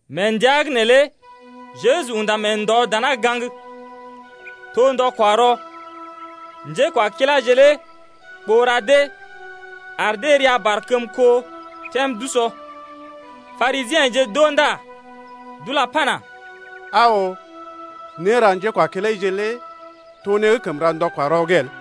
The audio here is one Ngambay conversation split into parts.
Mee ndəa’g neelé Jeju unda mee ndɔ dana gaŋg, to ndɔ-kwa-rɔ. Njékwakiláje lé ɓoo ra dee, ar dee ria barkəmko tem d’usɔ. Parisiḛje d’oo ndá d’ula pana: Aa oo, néra njékwakilaije lé to né gə́ kəm ra ndɔ-kwa-rɔ’g el.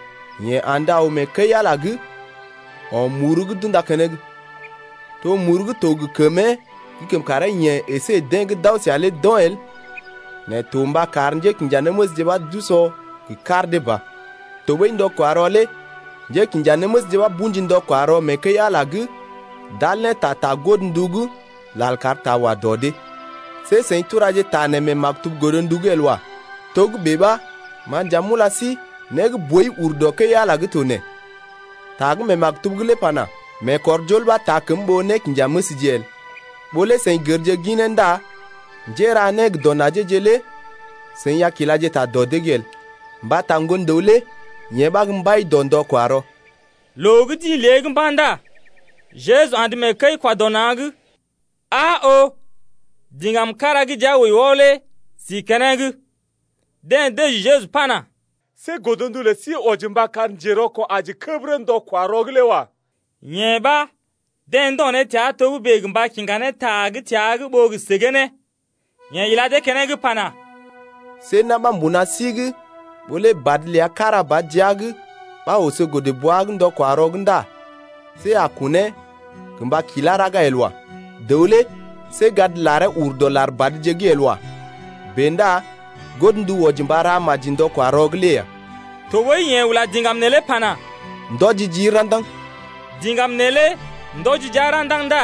Yeḛ andə aw mee kəi-Ala’g o̰ muru gə́ d’unda keneŋ. To muru gə́ to gə kəmee gə́ kəm karee-yeḛ əsé deḛ gə́ d’aw səa lé d’o̰ el nɛ to mba kar njékinjanéməsje ɓa d’o̰ gə kar dee ba. Tɔɓəi ndɔ-kwa-rɔ lé njékinjanéməsje ɓa bṵji ndɔ-kwa-rɔ mee kəi-Ala’g d’al ne ta ta godndu’g lal kar ta wa dɔ dee. See seḭ turaje ta nee mee maktub Godndu’g lé el wa. Togə́bè ɓa, ma nja m’ula sí, né gə́ boi ur dɔ kəi-Ala’g to nee. Ta gə́ mee maktub’g lé pana: Meekɔrjol ɓa taa kəm ɓó nékinjanéməsje el. Ɓó lé seḭ gərje ginee ndá njéra né gə dɔ najee-je lé seḭ a kilaje ta dɔ dee’g el. Mbata Ŋgon-dəw lé yeḛ ɓa gə́ mbai dɔ ndɔ-kwa-rɔ ya. Loo gə́ d’ḭ lée’g mba̰ ndá Jeju andə mee kəi-kwa-dɔ-na̰’g. Aa oo, diŋgam kára gə́ jia wəi wɔ lé si keneŋ. Deḛ dəji Jeju pana: See godndu lə sí wɔji mba kar njerɔko̰ aji kəbərə ndɔ-kwa-rɔ’g lé wa. Yee ɓa, deḛ ndo̰ ne təa togə́bè gə mba kiŋga ne ta gə́ təa’g ɓó gə səgee ne. Yeḛ ila dee keneŋ pana: See na̰ ɓa mbuna sí’g ɓó lé badə ləa kára ba jia’g ɓa oso godə-bwa’g ndɔ-kwa-rɔ’g ndá see a kunee gə mba kilá raga el wa. Dəw lé see gad laree ur dɔ lar badje’g el wa. Bèe ndá godndu wɔji mba ra maji ndɔ-kwa-rɔ’g lé ya. Tɔɓəi yeḛ ula diŋgam neelé pana: Ndɔji jii ra̰daŋ. Diŋgam neelé ndɔji jia ra̰daŋ ndá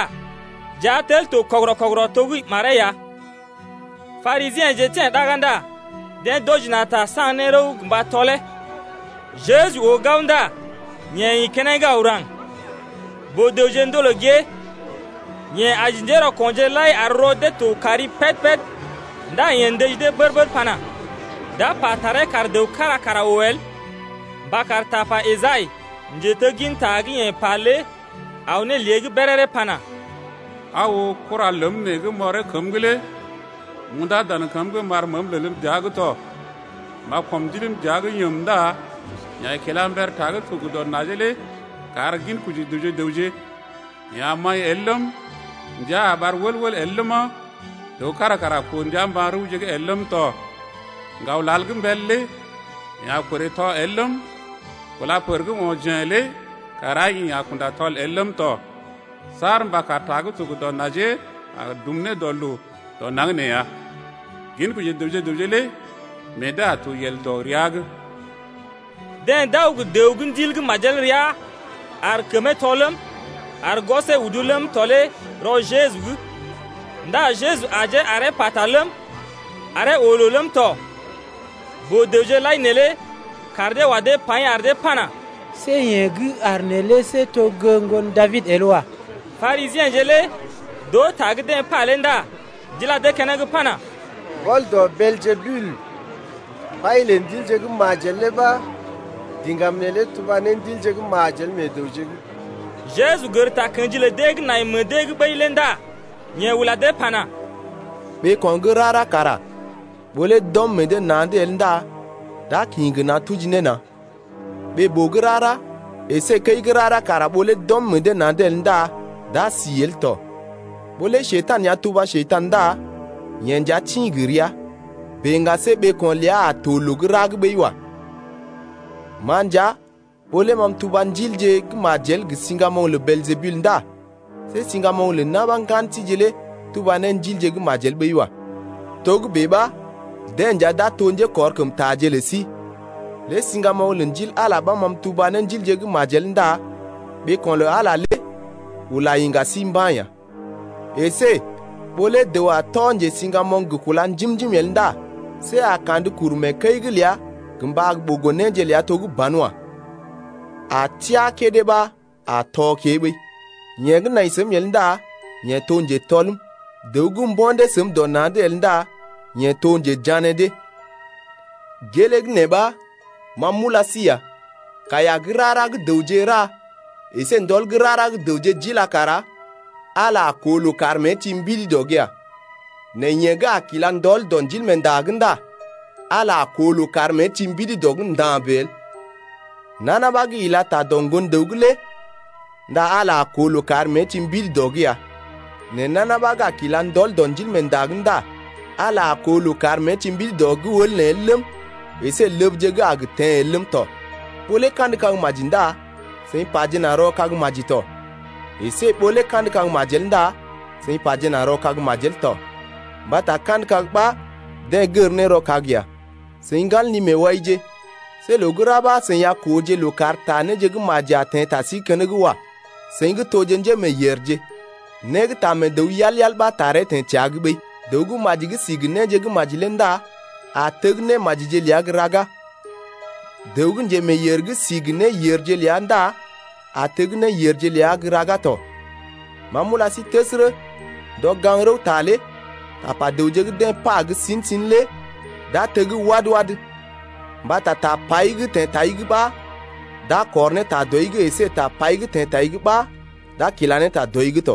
jia tel to kɔgərɔ-kɔgərɔ to gə́ maree ya. Parisiḛje teḛ ɗaga ndá deḛ d’wɔji na̰ ta saŋg ne rəw gə mba tɔlee. Jeju oo gao ndá yeḛ ḭ keneŋ aw gə́ raŋg. Boo-dəwje ndolè gée. Yeḛ aji njérɔko̰je lai ar rɔ dee to kari péd-péd ndá yeḛ ndəji dee bər-bər pana: D’a pa taree kar dəw kára kara oo el, mba kar tapa Esai, njetegginta gə́ yeḛ pa lé aw ne lée’g béréré pana: Aa oo, kura ləm nee gə́ m’ɔree kəm’g lé M’undá dan kəm’g m’ar məəm lelm dəa’g tɔ. M’a kɔm ndiləm dəa’g yəm Ndá yeḛ a kila mber ta gə́ to gə dɔ najee lé kar ginkoji dəwje gə raŋg. Yeḛ a maḭ el ləm, ndia a ɓar wəl-wəl el ləma, Dəw kára kara a koo ndia mba̰-rəwje’g el ləm tɔ. Ŋgawlal gə́ mbəl lé yeḛ a korè tɔ el ləm, Kúla pər gə́ o̰ jḛ̀ lé kara yeḛ a kunda tɔl el ləm tɔ Saar mba kar ta gə́ to gə dɔ najee a dum ne dɔ loo dɔ naŋg nee ya. Ginkoji dəwje-dəwje gə raŋg lé meḛ dee a to yel dɔ ria’g. Deḛ d’aw gə dəw gə́ ndil gə́ majel rəa ar kəmee tɔ ləm, ar gwɔsee udu ləm tɔ lé rɔ Jeju’g. Ndá Jeju ajee aree pata ləm, aree oo loo ləm tɔ. Boo-dəwje lai neelé kaar dee wa dee paḭ ar dee pana: See yeḛ gə́ aar neelé see to gə́ ŋgon Dabid el wa. Parisiḛje lé d’oo ta gə́ deḛ pa lé ndá d’ila dee keneŋ pana: Mbɔl dɔ Beeljebul, mbai lə ndilje gə́ majel lé ɓa diŋgam neelé tuba ne ndilje gə́ majel meḛ dəwje’g ya. Jeju gər takə̰ji lə dee gə́ nai meḛ dee’g ɓəi lé ndá yeḛ ula dee pana: Ɓeeko̰ gə́ rara kara ɓó lé d’ɔm meḛ dee na̰’d el ndá d’a kḭ gə na̰ tuji na̰. Ɓee-boo gə́ rara əsé kəi gə́ rara kara ɓó lé d’ɔm meḛ dee na̰’d el ndá d’a si el tɔ. Ɓó lé Njekurai ya tuba Njekurai ndá yeḛ nja tḭ gə rəa, bèe ŋga see ɓeeko̰ ləa a to loo gə́ ra gə́ ɓəi wa. Ma nja, ɓó lé ma m’tuba ndilje gə́ majel gə siŋgamoŋ lə Beeljebul ndá see siŋgamoŋ lə na̰ ɓa ŋgan síje lé tuba ne ndilje gə́ majel ɓəi wa. Togə́bè ɓa deḛ nja d’a to njékɔrkəmtaje lə sí. Lé siŋgamoŋ lə Ndil Ala lé ɓa ma m’tuba ne ndilje gə́ majel ndá ɓeeko̰ lə Ala lé ula iŋga sí mba̰ ya. Esé ɓó lé dəw a tɔ njesiŋgamoŋ gə kúla njim-njim el ndá see a kandə kuru mee kəi’g ləa gə mba ɓogo néje ləa to gə́ banwa. A teá kédé ɓa a tɔ kée ɓəi. Yeḛ gə́ nai səm el ndá yeḛ to njetɔlm. Dəw gə́ mbo̰ dee səm dɔ na̰’d el ndá yeḛ to njejané dee. Gelee gə́ nee ɓa ma m’ula sí ya: Kaiya gə́ rara gə́ dəwje ra əsé ndɔl gə́ rara gə́ dəwje d’ila kara Ala a koo loo kar mée ti mbidi dɔ’g ya. Nɛ yeḛ gə́ a kila ndɔl dɔ Ndilmeenda’g ndá Ala a koo loo kar mée ti mbidi dɔ’g nda̰ bèe el. Nana ɓa gə́ ila ta dɔ Ŋgon-dəw’g lé ndá Ala a koo loo kar mée ti mbidi dɔ’g ya. Nɛ nana ɓa gə́ a kila ndɔl dɔ Ndilmeenda’g ndá Ala a koo loo kar mée ti mbidi dɔ’g wəl nee el ləm, əsé ləbje gə́ a gə teḛ el ləm tɔ. Ɓó lé kandə kag maji ndá seḭ pajena rɔ kag maji tɔ, əsé ɓó lé kandə kag majel ndá seḭ pajena rɔ kag majel tɔ. Mbata kandə kag ɓa deḛ gər ne rɔ kag ya. Seḭ ŋgan li-meewaije, see loo gə́ ra ɓa seḭ a kooje loo kar ta néje gə́ maji a teḛ ta sí’g keneŋ wa seḭ gə́ toje njémeeyèrje. Né gə́ taa mee dəw yal-yal ɓa taree teḛ təa’g ɓəi. Dəw gə́ maji gə́ si gə néje gə́ maji lé ndá a teg némajije ləa gə́ raga. Dəw gə́ njemeeyèr gə́ si gə néyèrje ləa ndá a teg néyèrje ləa gə́ raga tɔ. Ma m’ula sí təsərə, ndɔ gaŋg-rəwta lé tapa dəwje gə́ deḛ pa gə́ sin-sin lé d’a teg wad-wad. Mbata tapai gə́ teḛ tai’g ɓa d’a kɔr ne ta dɔi’g əsé tapai gə́ teḛ tai’g ɓa d’a kila ne ta dɔi’g tɔ.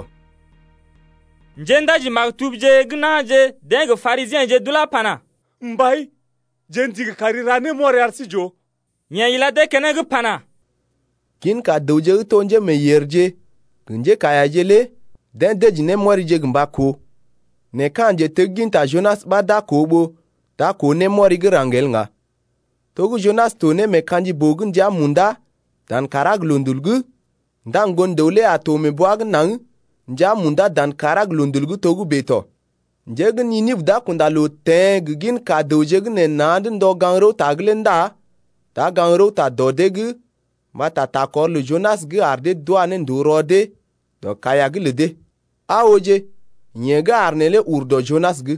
Njéndaji-maktubje gə́ na̰je deḛ gə Parisiḛje d’ulá pana: Mbai, jeḛ ndigi kari ra némɔri ar sí j’oo. Yeḛ ila dee keneŋ pana: Ginka dəwje gə́ to njémeeyèrje gə njékaiyaje lé deḛ dəji némɔrije gə́ mba koo. Nɛ ka̰ njetegginta Junas ɓa d’a koo ɓó d’a koo némɔri gə́ raŋg el ŋga. To gə́ Junas to ne mee ka̰ji-boo’g ndəa munda, dan kàrá gə loondul’g ndá Ŋgon-dəw lé a to mee bwa’g naŋg ndəa munda dan kàrá gə loondul’g togə́bè tɔ. Njé gə́ Ninibə d’a kunda loo teḛ gə ginka dəwje gə́ nee na̰’d ndɔ gaŋg-rəwta’g lé ndá d’a gaŋg-rəwta dɔ dee’g mbata takɔr lə Junas gə́ ar dee d’wa ne ndòo rɔ dee dɔ kaiya’g lə dee. Aa ooje, yeḛ gə́ aar neelé ur dɔ Junas’g.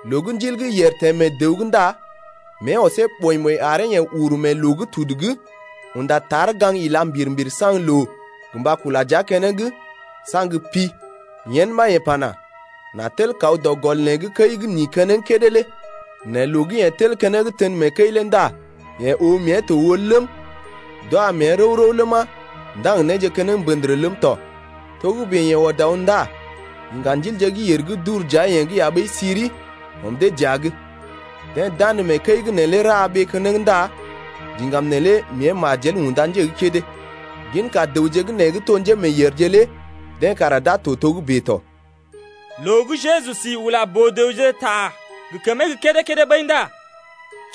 Loo gə́ ndil gə́ yèr teḛ mee dəw’g ndá mée ɔsee ɓɔḭ-ɓɔḭ aree yeḛ uru mee loo gə́ tudu’g unda tar gaŋg ila mbir-mbir saŋg loo gə mba kula dəa keneŋ, nɛ saŋg pi. Yen ɓa yeḛ pana: N’a tel kaw dɔ gɔl neḛ’g kəi gə́ n’ḭ keneŋ kédé lé. Nɛ loo gə́ yeḛ tel keneŋ tən mee kəi lé ndá yeḛ oo mée to wəl ləm, d’wa mee rəw-rəw ləma, ndaŋg néje keneŋ mèr ləm tɔ. Togə́bè yeḛ ɔd aw ndá iŋga ndilje gə́ yèr gə́ d’ur dəa-yeḛ’g ya ɓəi siri, ɔm dee dəa’g. Deḛ d’andə mee kəi’g neelé ra ɓee keneŋ ndá diŋgam neelé mée majel unda nje gə́ kédé. Ginka dəwje gə́ nee gə́ to njémeeyèrje lé deḛ kara d’a to togə́bè tɔ. Loo gə́ Jeju si ula boo-dəwje ta gə kəmee gə́ kédé-kédé ɓəi ndá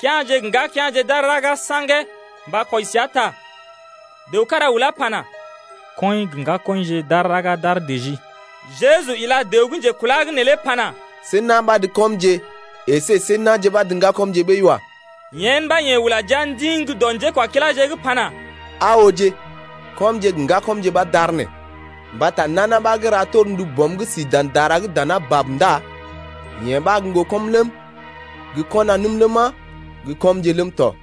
kea̰je gə ŋgakea̰je d’aar raga saŋgee mba kwɔji səa ta. Dəw kára ulá pana: Kɔḭ gə ŋgakɔḭje d’aar raga d’aar dəjii. Jeju ila dəw gə́ njekula’g neelé pana: See na̰ ɓa’d kɔmje əsé see na̰je ɓa’d ŋgakɔmje ɓəi wa. Yen ɓa yeḛ ula jia ndiŋ gə́ dɔ njékwakiláje’g pana: Aa ooje, kɔmje gə ŋgakɔmje ɓa d’aar nee. Mbata nana ɓa gə́ ra torndu Bɔm gə́ si dan dara’g dana bab ndá yeḛ ɓa gə́ ŋgokɔm ləm, gə kɔnanəm ləma, gə kɔmje ləm tɔ.